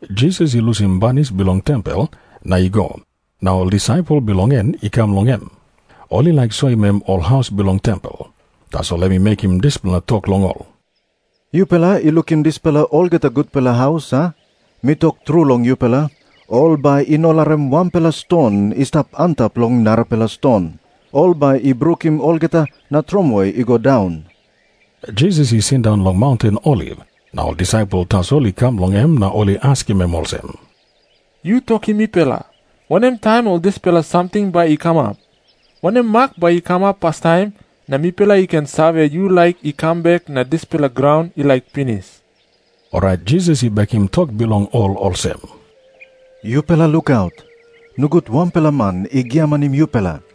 Jisas i lusim banis bilong tempel na i go, na ol disaipel bilong en i kam long em. Ol i laik soim em ol haus bilong tempel. Tasol em i mekim dispela tok long ol, “Yupela i lukim dispela olgeta gutpela haus, a? Mi tok tru long yupela, ol bai i no larim wanpela ston i stap antap long narapela ston. Ol bai i brukim olgeta na tromoi i go daun.” Jisas i sindaun long maunten Oliv, na ol disaipel tasol i kam long em na ol i askim em olsem, “Yu tokim mipela, wanem taim ol dispela samting bai i kamap? Wanem mak bai i kamap pastaim, na mipela i ken save, yu laik i kam bek na dispela graun i laik pinis?” Orait Jisas i bekim tok bilong ol olsem, “Yupela lukaut. Nogut wanpela man i giamanim yupela.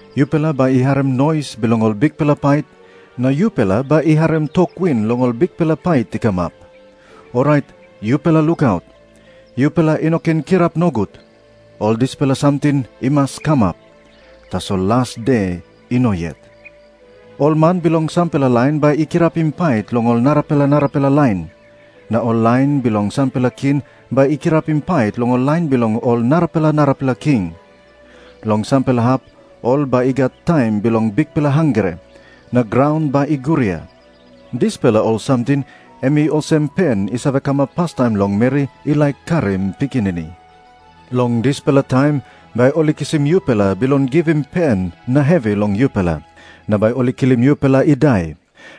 Yupela bai i harim nois bilong ol bikpela pait, na yupela bai i harim tok win long ol bikpela pait i kamap. Orait yupela lukaut. Yupela i no ken kirap nogut. Ol dispela samting i mas kamap, tasol las de i no yet. Ol man bilong sampela lain bai i kirapim pait long ol narapela narapela lain. Na ol lain bilong sampela king bai i kirapim pait long ol lain bilong ol narapela narapela king. Long sampela hap ol bai i gat taim bilong bikpela hangre, na graun bai i guria. Dispela ol samting em i olsem pen i save kamap pastaim long meri i laik karim pikinini. “Long dispela taim bai ol i kisim yupela bilong givim pen na hevi long yupela, na bai ol i kilim yupela i dai.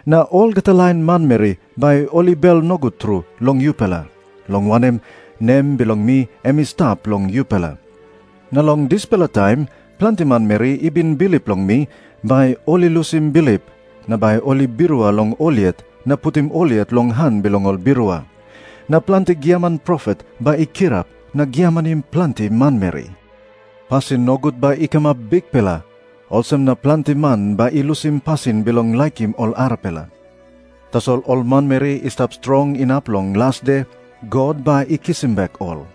Na olgeta lain manmeri bai ol i bel nogut tru long yupela, long wanem, nem bilong mi em i stap long yupela. Na long dispela taim planti manmeri i bin bilip long mi bai ol i lusim bilip, na bai ol i birua long ol yet na putim ol yet long han bilong ol birua. Na planti giaman profet bai i kirap na giamanim planti manmeri. Pasin nogut bai i kamap bikpela, olsem na planti man bai i lusim pasin bilong laikim ol arapela. Tasol ol manmeri i stap strong inap long las de, God bai i kisim bek ol.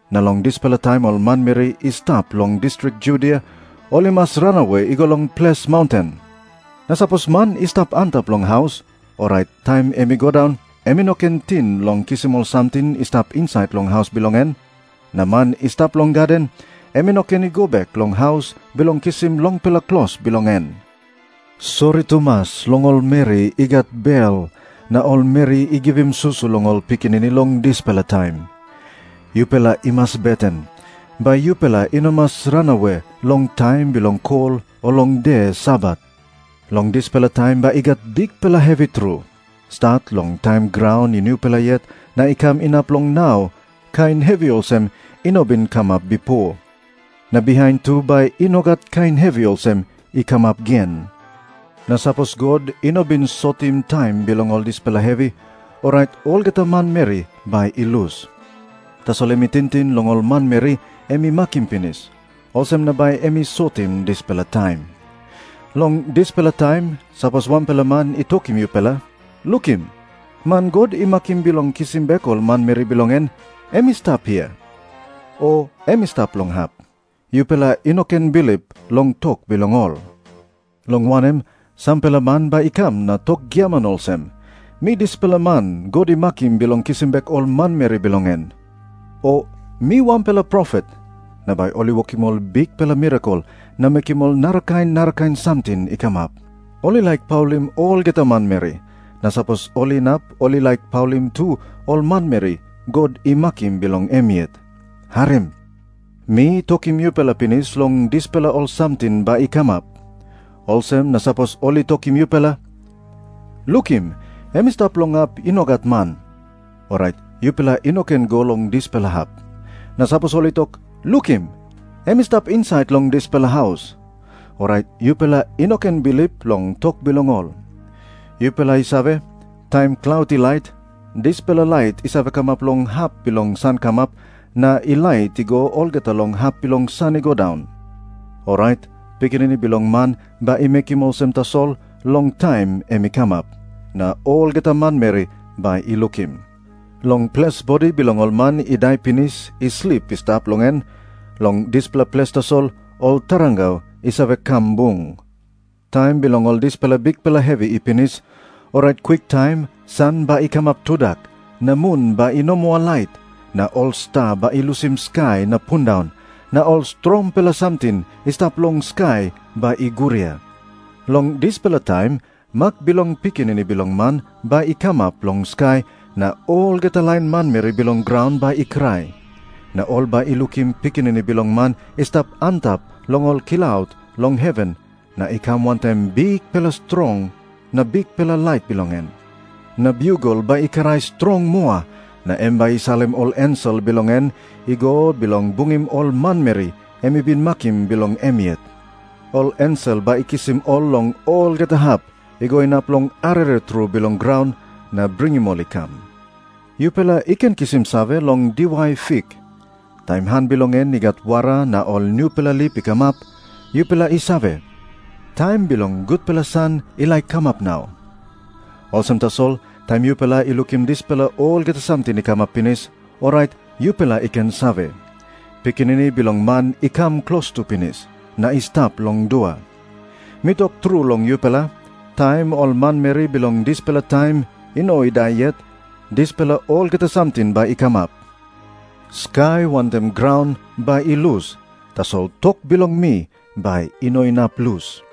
“Na long dispela taim ol manmeri i stap long distrik Judia ol i mas ranawe i go long ples maunten. Na sapos man i stap antap long haus, orait taim em i go daun em i no ken ting long kisim ol samting i stap insait long haus bilong en. Na man i stap long gaden, em i no ken i go bek long haus bilong kisim longpela klos bilong en. Sori tumas long ol meri i gat bel na ol meri i givim susu long ol pikinini long dispela taim. Yupela i mas beten, bai yupela i no mas ranawe long taim bilong kol o long de Sabat. Long dispela taim bai i gat bikpela hevi tru. Stat long taim graun i nupela yet na i kam inap long nau, kain hevi olsem i no bin kamap bipo. Na bihain tu bai i no gat kain hevi olsem i kamap gen. Na sapos God i no bin sotim taim bilong ol dispela hevi, orait olgeta manmeri bai i lus. Tasol em i tingting long ol manmeri em i makim pinis. Olsem na bai em i sotim dispela taim. “Long dispela taim, sapos wanpela man i tokim yupela, ‘Lukim, man God i makim bilong kisim bek ol manmeri bilong en, em i stap hia,’ o ‘Em i stap long hap,’ yupela i no ken bilip long tok bilong ol. Long wanem, sampela man bai i kam na tok giaman olsem, ‘Mi dispela man God i makim bilong kisim bek ol manmeri bilong en,’ o ‘Mi wanpela profet.’ Na bai ol i wokim ol bikpela mirakel na mekim ol narakain narakain samting i kamap. Ol i laik paulim olgeta manmeri, na sapos ol inap ol i laik paulim tu ol manmeri God i makim bilong em yet. “Harim. Mi tokim yupela pinis long dispela ol samting bai i kamap. Olsem na sapos ol i tokim yupela, ‘Lukim, em i stap long hap i no gat man,’ orait yupela i no ken i go long dispela hap. Na sapos ol i tok, ‘Lukim, em i stap insait long dispela haus,’ orait yupela i no ken bilip long tok bilong ol. Yupela i save, taim klaut i lait, dispela lait i save kamap long hap bilong sankamap na i lait i go olgeta long hap bilong san i go daun. Orait Pikinini Bilong Man bai i mekim olsem tasol long taim em i kamap, na olgeta manmeri bai i lukim. “Long ples bodi bilong ol man i dai pinis i slip i stap long en, long dispela ples tasol ol tarangau i save kam bung.” Jisas i tok moa olsem, “Taim bilong ol dispela bikpela hevi i pinis, orait kwiktaim san bai i kamap tudak, na mun bai i no moa lait, na ol sta bai i lusim skai na pundaun, na ol strongpela samting i stap long skai bai i guria. Long dispela taim mak bilong Pikinini Bilong Man bai i kamap long skai na olgeta lain manmeri bilong graun bai i krai. Na ol bai i lukim Pikinini Bilong Man i stap antap long ol klaut bilong heven na i kam wantaim bikpela strong na bikpela lait bilong en. Na biugel bai i krai strong moa, na em bai i salim ol ensel bilong en i go bilong bungim ol manmeri em i bin makim bilong em yet. Ol ensel bai i kisim ol long olgeta hap, i go inap long arere tru bilong graun, na bringim ol i kam.” Jisas i tok moa olsem, “Yupela i ken kisim save long diwai fik. Taim han bilong en i gat wara na ol nupela lip i kamap, yupela i save, taim bilong gutpela san i laik kamap nau. Olsem tasol, taim yupela i lukim dispela olgeta samting i kamap pinis, orait yupela i ken save, Pikinini Bilong Man i kam klostu pinis, na i stap long dua. Mi tok tru long yupela, taim ol manmeri bilong dispela taim i no i dai yet, dispela olgeta samting bai i kamap. Skai wantaim graun bai i lus, tasol tok bilong mi bai i no inap lus.”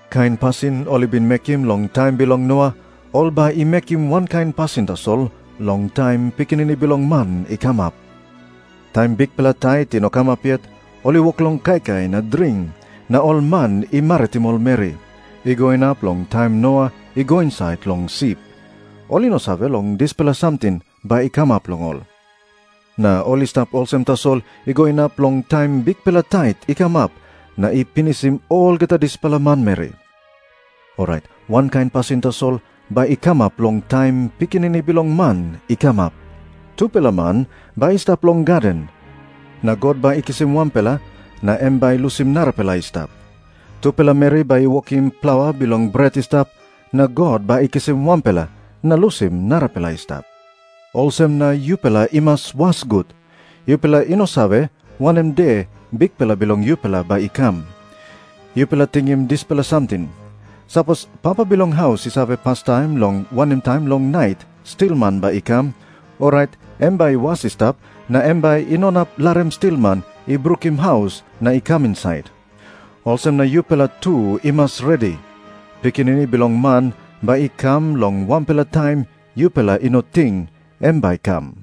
Kain pasin ol i bin mekim long taim bilong Noa, ol bai i mekim wankain pasin tasol long taim Pikinini Bilong Man i kamap. Taim bikpela tait i no kamap yet, ol i wok long kaikai na dring, na ol man i maritim ol meri, i go inap long taim Noa i go insait long sip. Ol i no save long dispela samting bai i kamap long ol, na ol i stap olsem tasol i go inap long taim bikpela tait i kamap na i pinisim olgeta dispela manmeri. Orait wankain pasin tasol bai i kamap long taim Pikinini Bilong Man i kamap. Tupela man bai i stap long gaden, na God bai i kisim wanpela, na em bai i lusim narapela i stap. Tupela meri bai i wokim plaua bilong bret i stap, na God bai i kisim wanpela na lusim narapela i stap. Olsem na yupela i mas was gut. Yupela i no save wanem de Bikpela bilong yupela bai i kam. Yupela tingim dispela samting. Sapos papa bilong haus i save pastaim long wanem taim long nait stilman bai i kam, orait em bai i was i stap na em bai i no inap larim stilman i brukim haus na i kam insait. Olsem na yupela tu i mas redi. Pikinini Bilong Man bai i kam long wanpela taim yupela i no ting em bai i kam.”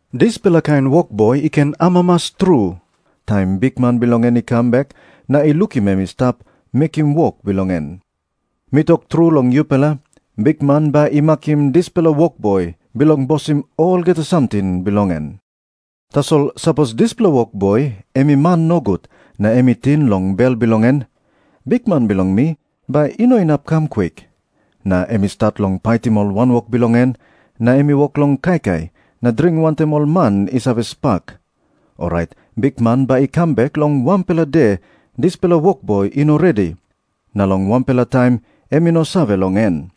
Dispela kain wokboi i ken amamas tru taim bikman bilong en i kam bek na i lukim em i stap mekim wok bilong en. Mi tok tru long yupela, bikman bai i makim dispela wokboi bilong bosim olgeta samting bilong en. Tasol sapos dispela wokboi em i man nogut na em i ting long bel bilong en, ‘Bikman bilong mi bai i no inap i kam kwik,’ na em i stat long paitim ol wanwok bilong en, na em i wok long kaikai na dring wantaim ol man i save spak, orait bikman bai i kam bek long wanpela de dispela wokboi i no redi, na long wanpela taim em i no save long en.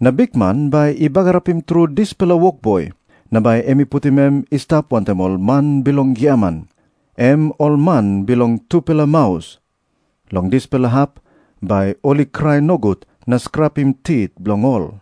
Na bikman bai i bagarapim tru dispela wokboi, na bai em i putim em i stap wantaim ol man bilong giaman, em ol man bilong tupela maus. Long dispela hap bai ol i krai nogut na skrapim tit bilong ol.”